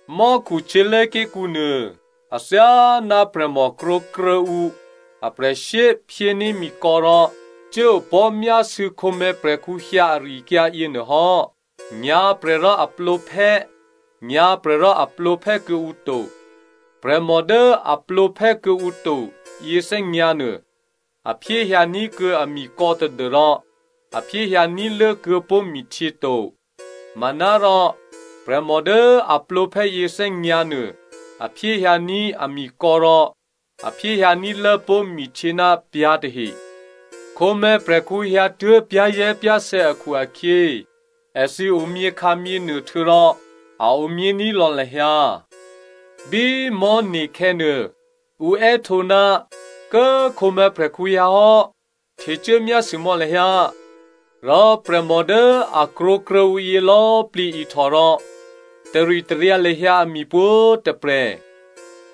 “Mò́khu htyělé̤ké̤kǔ nuô, athyáná prè̤mò krwǒkruô̌ ǔ aprè̤shyé phyéní̤ mikò̌ rò cuốopò̤́ myásû̌ khǒmè̤̌ prè̤khǔ hyǎ ari-akyǎ yěnuô hò́. Nyǎ̤prè̤ rò a plǒphè́, nyǎ̤prè̤ rò a plǒphè́ kuô̌ǔ to. Prè̤mò dố a plǒphè́ kuô̌ǔ to yěthè́nyǎ̤ nuô, a phyéhyǎ ní̤kuô̌ amikò̌ tadû́rò a phyéhyǎ ní̤lố kuô̌pó̤ mihtyě to. Manárò prè̤mò dố a plǒphè́ yěthè́nyǎ̤ nuô a phyéhyǎní̤ amikò̌ rò a phyéhyǎní̤lố pó̤ mihtyě ná pyǎ̤ tahe. Khǒmè̤̌prè̤khǔ hyǎtuố̤ pyá̤zè̤́pyá̤sè̌ akhu-akhyě èthǐ omyěkhǎmyěnuô htuô̌rò a omyění̤ lò̌ lahyǎ. “Bí mò̤́ne̤khè̌ nuô, ǔ è́htǒ, ‘Kố꤮ khǒmè̤̌prè̤khǔ hyǎhò́, htecuố myásû mò̌ lahyǎ.’ “Rò prè̤mò dố a krwǒkruô̌ ǔ yělò̌꤮ plǐ ihtò rò taritaryǎ lahyǎ ami pwǒ̤꤮ tôprè̤.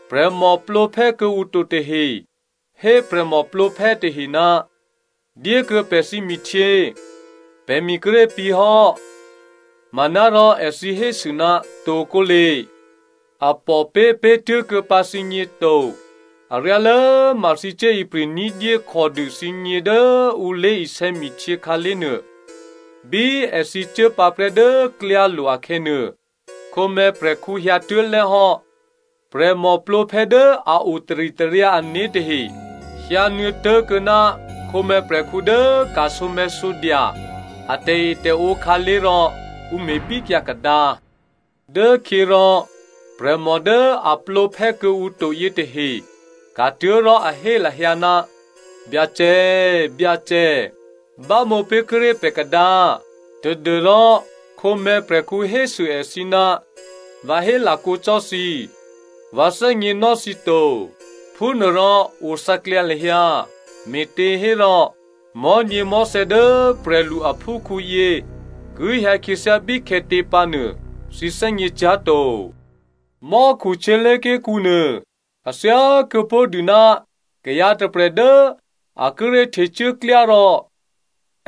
Prè̤mò plǒphè́ kuô̌ǔ to tahe hé prè̤mò plǒphè́ tahe, ‘Dyékuô̌ pè̤ thǐmihtyě, pè̤mi kíré̤ pǐ̤hò́.’ “Manárò èthǐ hésû, ‘Tokǒle, a pòpé̤ tuố̤kuô̌ pǎ thǐgně to, aryálố ma thǐ cuốipri̤ ní̤dyé khòdû thǐgně dố ǔ lé̤isè̌ mihtyě khǎlé̤nuô.’ “Bí èthǐ cuốpǎprè́ dố klyálo̤ akhè̌nuô, khǒmè̤̌prè̤khǔ hyǎtuố̤ lè́hò́, prè̤mò plǒphè́ dố a o taritaryǎ ané̤ tahe hyǎnuô̌ tố̤kuô̌ ná khǒmè̤̌prè̤khǔ dố ka̤sǒmè̤̌sǒdya a tè̤etè̤ǒ khǎlé̤ rò ǔ me̤bíkyǎ kadǎ. “Dốkhyě rò prè̤mò dố a plǒphè́ kuô̌ǔ to yětahe ka̤tuố̤ rò a hé lahyǎ, ‘Byacè, Byacè, bámǒ pé̤kuô̌ ré̤ pè̤ kadǎ.’ “Tadû́rò khǒmè̤̌ prè̤khǔ hésû èthǐ, ‘Vǎ hélakǒ cò́ thǐ, vǎ thè́gněnò́ thǐ to.’ “Phúnuôrò othǎklyǎ lahyǎ, me̤těhérò mò̤́nyěmò̤́thè̌ dố prè̤lu aphúkhǔ yě ki hyǎkhyěthyá bíkhè̌tě pǎnuô thǐ thè́gněcyá̤to. “Mò́khu htyělé̤ké̤kǔ nuô a thyá kuô̌pó̤dû ná kayǎ tôprè̤ dố a kíré̤ htecuố klyá rò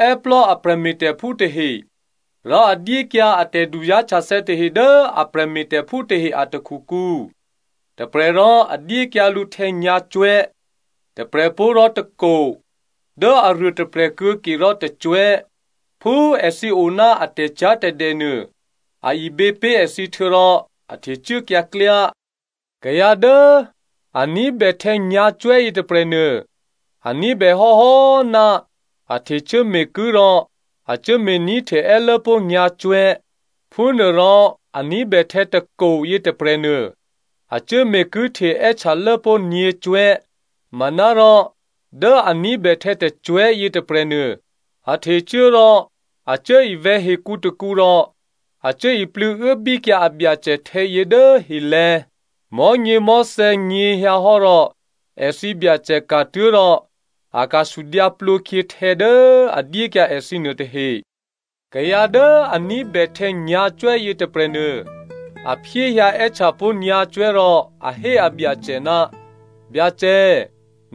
è́plò́ a prè̤me̤tè̤phú tahe, rò a dyékyǎ a tè̤duzá̤htyathè̌ tahe dố a prè̤me̤tè̤phú tahe a takhukǔ. Tôprè̤ rò a dyékyǎ lǔ htè̌ nyǎ̤cwè̤́, tôprè̤pó̤ rò tôko, dố aruôtôprè̤ kuô̌ke rò tôcwè̤́, phú èthǐ oná a tè̤cyá̤tè̤dè nuô a ibě pé̤ èthǐ htuô̌rò a htecuốkyǎ klyá. Kayǎ dố a ní̤bè htè̌ nyǎ̤cwè̤́ yětôprè̤nuô, a ní̤bè hò́hò́ ná a htecuố me̤kuố̤ rò a cuố me̤ní̤hte è́lốpó̤ nyǎ̤cwè̤́. Phúnuôrò a ní̤bè htè̌ tôko yětôprè̤nuô, a cuố me̤kuố̤hte è́htyalố pó̤ nyě̤cwè̤́. Manárò dố a ní̤bè htè̌ tôcwè̤́ yětôprè̤nuô, a htecuố rò a cuố ivè̤̌ hekǔ tôkǔ rò a cuố iplû̌ uốbíkyǎ abyacè htè̌yě dố helè̤̌. “Mò̤́nyěmò̤́thè̌ nyě̤hyǎhò́ rò èthǐ Byacè ka̤tuố̤ rò a ka̤sudyǎ plǒkhyě htè̌ dố a dyékyǎ èthǐ nuôtahe. Kayǎ dố a ní̤bè htè̌ nyǎ̤cwè̤́ yětôprè̤nuô, a phyéhyǎ è́htyapó̤ nyǎ̤cwè̤́ rò a hé abyacè, ‘Byacè,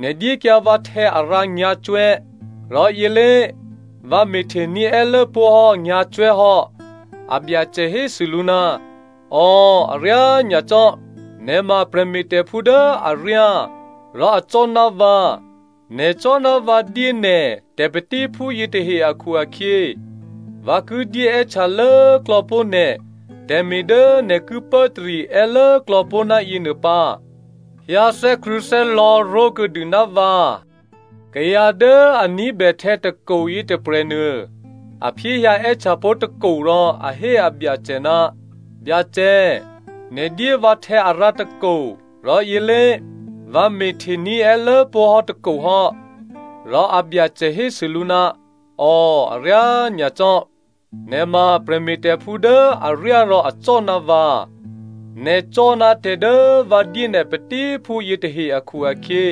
nè̤ dyékyǎ vǎ htè̌arǎ nyǎ̤cwè̤́. Rò yělé, vǎ me̤htení̤ è́lốpó̤ hò́ nyǎ̤cwè̤́ hò́.’ “Abyacè hésû lǔ, ‘Ò, aryá nyacò́, nè̤ ma prè̤me̤tè̤phú dố aryá rò acò́ ná vǎ, nè̤ cò́ ná vǎ dyé nè̤ tè̤patíphú yětahe akhu-akhyě, vǎ ki dyé è́htya lố꤮ klò̌pó̤ nè̤ tè̤me̤ dố nè̤ ki pốtarí è́lốklò̌ pó̤ ná yěnuô pǎ. Hyǎ thè́krṳ̂̌thè́lò̌ ró̤kuô̌dû ná vǎ.’ “Kayǎ dố a ní̤bè htè̌ tôko yětôprè̤nuô, a phyéhyǎ è́htyapó̤ tôko rò a hé abyacè, ‘Byacè, nè̤ dyé vǎ htè̌ arǎ tôko, rò yělé, vǎ me̤ htení̤ è́lốpó̤ hò́ tôko hò́.’ “Rò abyacè hésû lǔ, ‘Ò, aryá nyacò́. Nè̤ ma prè̤me̤tè̤phú dố aryá rò acò́ ná vǎ. Nè̤ cò́ ná tè̤ dố vǎ dyé nè̤ patíphú yětahe akhu-akhyě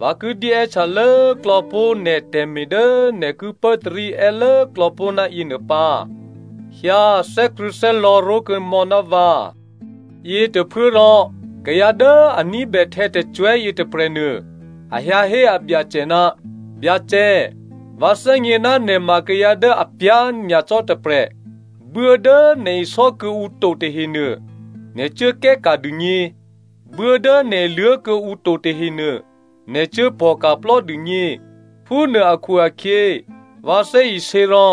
vǎ ki dyé è́htya lố꤮ klò̌pó̤ nè̤ tè̤me̤ dố nè̤ ki pốtarí è́lố klò̌pó̤ ná yěnuô pǎ. Hyǎ thè́krṳ̂̌thè́lò̌ ró̤kuô̌mò̌ ná vǎ!’ “Yětôphuốrò kayǎ dố a ní̤bè htè̌ tôcwè̤́ yětôprè̤nuô a hyǎhé abyacè, ‘Byacè, vǎ thè́gně ná nè̤ ma kayǎ dố apyá̤ nyacò́ tôprè̤. Buố dố nè̤ isò́ kuô̌ǔ to tahenuô nè̤ cuố kè́ka̤ dûgně, buố dố nè̤ iluố̤ kuô̌ǔ to tahenuô nè̤ cuốpò̤ka̤plò́ dûgně. Phúnuô akhu-akhyě vǎ thè́isě rò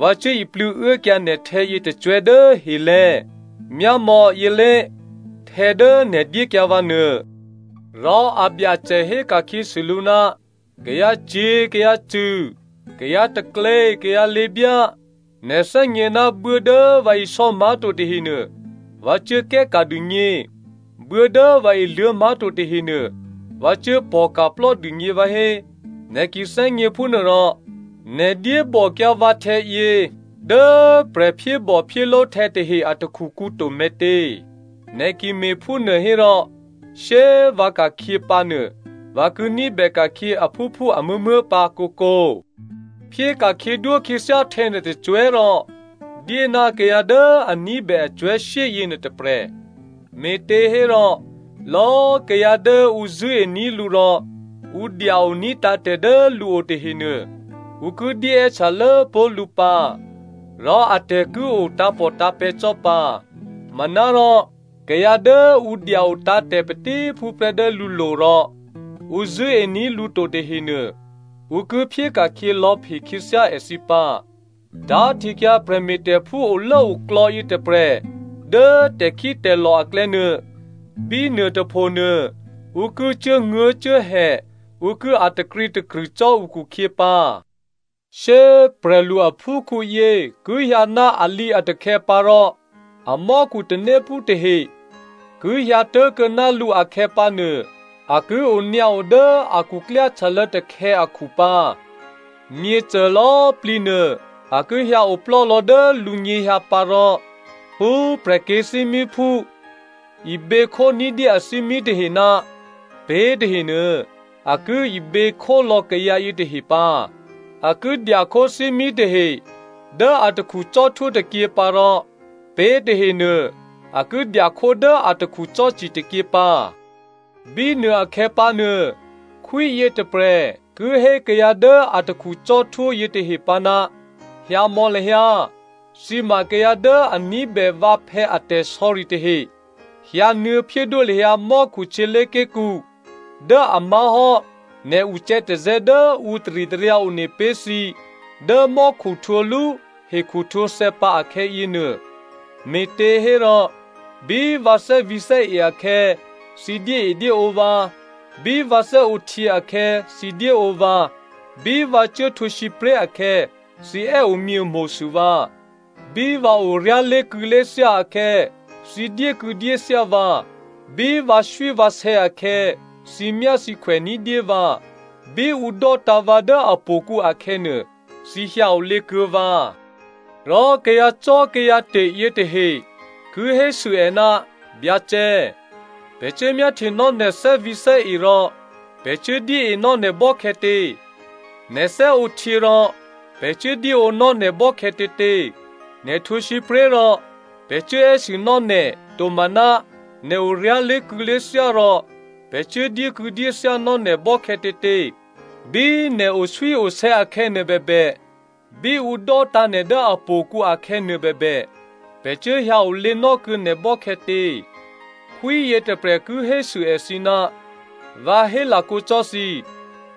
vǎ cuố iplû̌ uốkyǎ nè̤htè̌ yětôcwè̤́ dố helè̤̌, myámò̌, yělé꤮ htè̌ dố nè̤ dyékyǎ vǎ nuô.’ “Rò abyacè héka̤khyěsû lǔ, ‘Kayǎcyě̤ kayǎcṳ̂, kayǎtaklě kayǎlěbyá, nè̤ thè́gně ná buố dố vǎ isò́ má̤to tahenuô, vǎ cuố kè́ka̤ dûgně, buố dố vǎ iluố̤ má̤to tahenuô vǎ cuố pò̤ka̤plò́ dûgně vǎhé? Nè̤ ki thè́gně phúnuôrò nè̤ dyébòkyǎ vǎ htè̌yě dố prè̤ phyébòphyéló̤ htè̌tahe a takhukǔ to me̤tě? Nè̤ ki me̤phúnuô hérò shyé꤮ vǎ ka̤khyě pǎnuô vǎ ki ní̤bè ka̤khyě aphúphú amuố̤muố̤ pǎ kǒkǒ. “‘Phyé ka̤khyědwó khyěthyá htè̌nuô tôcwè̤́ rò dyé ná kayǎ dố a ní̤bè acwè̤́shyé yěnuô tôprè̤. Me̤těhérò lò̌꤮ kayǎ dố ǔ zṳ̂́ení̤ lǔ rò ǔ dya-oní̤ tǎ̤tè̤ dố lǔo tahenuô, ǔ ki dyéè́htya lố꤮ pó̤ lǔ pǎ. Rò atè̤ ki o tǎ̤pòtǎ̤pè̤̌ cò́ pǎ. Manárò kayǎ dố ǔ dya-o tǎ̤tè̤ patíphúprè́ dố lǔlo̤ rò ǔ zṳ̂́ení̤ lǔ to tahenuô, ǔ ki phyéka̤khyě lò̌phe khyěthyá èthǐ pǎ. Tá̤htekyǎ prè̤me̤tè̤phú olốoklò̌ yětôprè̤ dố tè̤khítè̤lò̤ aklè̌ nuô. Bínuôtôphonuô ǔ ki cuốnguố̤cuốhè, ǔ ki a̤ takrǐtakrṳ̂ cò́ ǔkhukhyě pǎ.’ “Shyé꤮ prè̤lu aphúkhǔyě ki hyǎ ná alǐatakhè̌ pǎ rò amò́khu tanéphú tahe ki hyǎ tố̤kuô̌ ná lǔ akhè̌pǎnuô a ki onyǎo dố a khuklyáhtyalô̌ takhè̌ akhu pǎ. Myěcô lò̌꤮ plǐ nuô a ki hyǎ oplò́lò̌ dố lǔnyěhyǎ pǎ rò phú prè̤kyě̤thímíphú iběkhó ní̤dyé athímí tahe ná pé̤ tahenuô, a ki ibě khólò̌ kayǎ yětahe pǎ. A ki dyakhó thímí tahe dố atakhu cò́htwó tôkyě pǎ rò pé̤ tahenuô a ki dya khó dố atakhu cò́ci tôkyě pǎ. “Bínuôakhè̌ pǎnuô, khwí yětôprè̤ ki hé kayǎ dố atakhu cò́htwó yětahe pǎ, ‘Hyǎmò̌ lahyǎ, thǐ ma kayǎ dố a ní̤bè vǎphè̌ a tè̤sò̌ri tahe, hyǎnuô̌ phyédwó lahyǎ mò́khu htyělé̤ké̤kǔ dố a má̤hò́ nè̤ ucè̌tazè̌ dố ǔ taritaryǎ one pé̤ thǐ dố mò́khu htwǒlú hekhu htwǒthè̌pǎ akhè̌yě nuô. Me̤těhérò bí vǎ thè́vǐ̤thè́e akhè̌ thǐ dyéedyéǒ vǎ, bí vǎ thè́ǒhtyě akhè̌ thǐ dyéǒ vǎ, bí vǎ cuốhtwǒ sǐpré̤ akhè̌ thǐ è́omyě mo̤sû vǎ. Bí vǎ oryá̤ lé̤kû̌lé̤thyá akhè̌, thǐ dyékû̌dyéthyá vǎ, bí vǎswívǎsè̌ akhè̌, thǐmyáthǐkhwè ní̤dyé vǎ. Bí ǔ dò́tǎ̤ vǎ dố htò̌kǔ akhè̌nuô, thǐ hyǎ olě kuô̌ vǎ.’ “Rò kayǎcò́kayǎte̤ yětahe ki hésû è, ‘Byacè, pè̤ cuốmyáhtyenò́ nè̤ thè́vǐ̤thè́e rò pè̤ cuố dyéenò́ nè̤ bò́khè̌tě? Nè̤ thè́ǒhtyě rò pè̤ cuố dyéǒnò́ nè̤ bò́khè̌tětě? Nè̤ htwǒ sǐpré̤ rò pè̤ cuố è́sûnò́ nè̤, tomaná nè̤ oryá̤ lé̤kû̌lé̤thyá rò pè̤ cuố dyékû̌dyéthyánò́ nè̤ bò́khè̌tětě? Bí nè̤ oswíosè̌ akhè̌nuô bèbè, bí ǔ dò́tǎ̤ nè̤ dố htò̌kǔ akhè̌ nuôbèbè pè̤ cuố hyǎ olěnò́ kuô̌ nè̤ bò́khè̌tě?’ “Khwí yětôprè̤ ki hésû èthǐ, ‘Vǎ hélakǒ cò́ thǐ,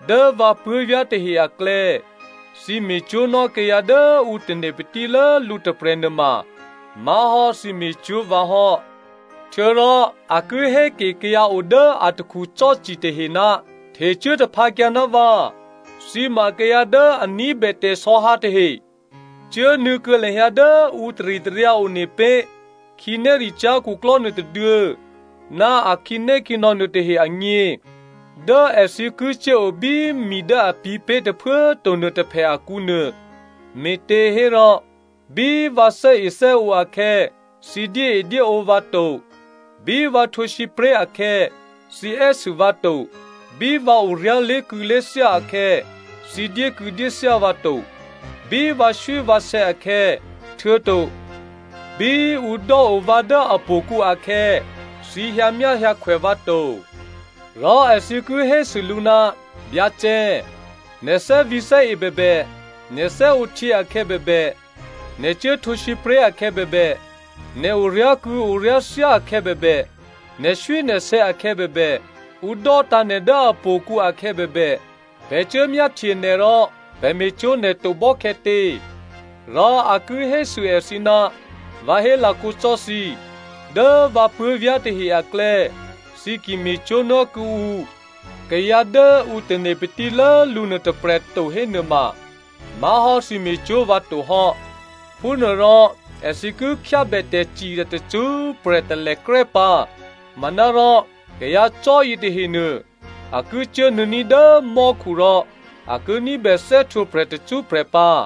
dố vǎ puố̤vyá̤ tahe aklè̌, thǐ me̤cwó̤nò́ kayǎ dố ǔ tane̤ patílố lǔ tôprè̤ nuôma má̤hò́ thǐ me̤cwó̤ vǎ hò́.’ “Htuô̌rò a ki héke kayǎ o dố atakhu cò́ci tahe, ‘Htecuố taphǎkyǎ ná vǎ, thǐ ma kayǎ dố a ní̤bè tè̤sò̌hǎ tahe, cuốnuô̌ kuô̌ lahyǎ dố ǔ taritaryǎ one pé̤ khǐnéricyá̤ khuklò́ nuôtôduô̌ ná a khǐnékhǐnò̌ nuôtahe agně dố èthǐ ki cuốo bí mi dố a pǐ̤pé̤ tôphuố꤮ to nuôtôphè akǔ nuô. Me̤těhérò bí vǎ thè́ethè́ǒ akhè̌, thǐ dyéedyéǒ vǎ to. Bí vǎ htwǒ sǐpré̤ akhè̌, thǐ è́sû vǎ to. Bí vǎ oryá̤ lé̤kû̌lé̤thyá akhè̌, thǐ dyékû̌dyéthyá vǎ to. Bí vǎswívǎsè̌ akhè̌, htuô̌to bí ǔ dò́o vǎ dố htò̌kǔ akhè̌, thǐ hyǎmyáhyǎkhwè vǎ to.’ “Rò èthǐ ki hésû lǔ, ‘Byacè, nè̤ thè́vǐ̤thè́e bèbè, nè̤ thè́ǒhtyě akhè̌ bèbè, nè̤ cuố htwǒ sǐpré̤ akhè̌ bèbè, nè̤ oryá̤kû̌ oryá̤thyá akhè̌ bèbè, nè̤swínè̤sè̌ akhè̌ bèbè, ǔ dò́tǎ̤ nè̤ dố htò̌kǔ akhè̌ bèbè, pè̤ cuốmyáhtye nè̤ rò pè̤ me̤cwó̤ nè̤ to bò́khè̌tě?’ “Rò a ki hésû èthǐ, ‘Vǎ hélakǒ cò́ thǐ, dố vǎ puố̤vyá̤ tahe aklè̌, thǐ ki me̤cwó̤nò́ kuô̌ǔ kayǎ dố ǔ tane̤ patílố lǔ nuôtôprè̤꤮ to hénuôma má̤hò́ thǐ me̤cwó̤ vǎ to hò́.’ “Phúnuôrò èthǐ ki khyábè tè̤cirya tacṳ́prè̤ talèkrè́ pǎ, manárò kayǎ cò́ yětahenuô a ki cuố nuô̌ní̤ dố mò́khu rò a ki ní̤bè thè́htwǒprè̤ tacṳ́prè̤ pǎ.”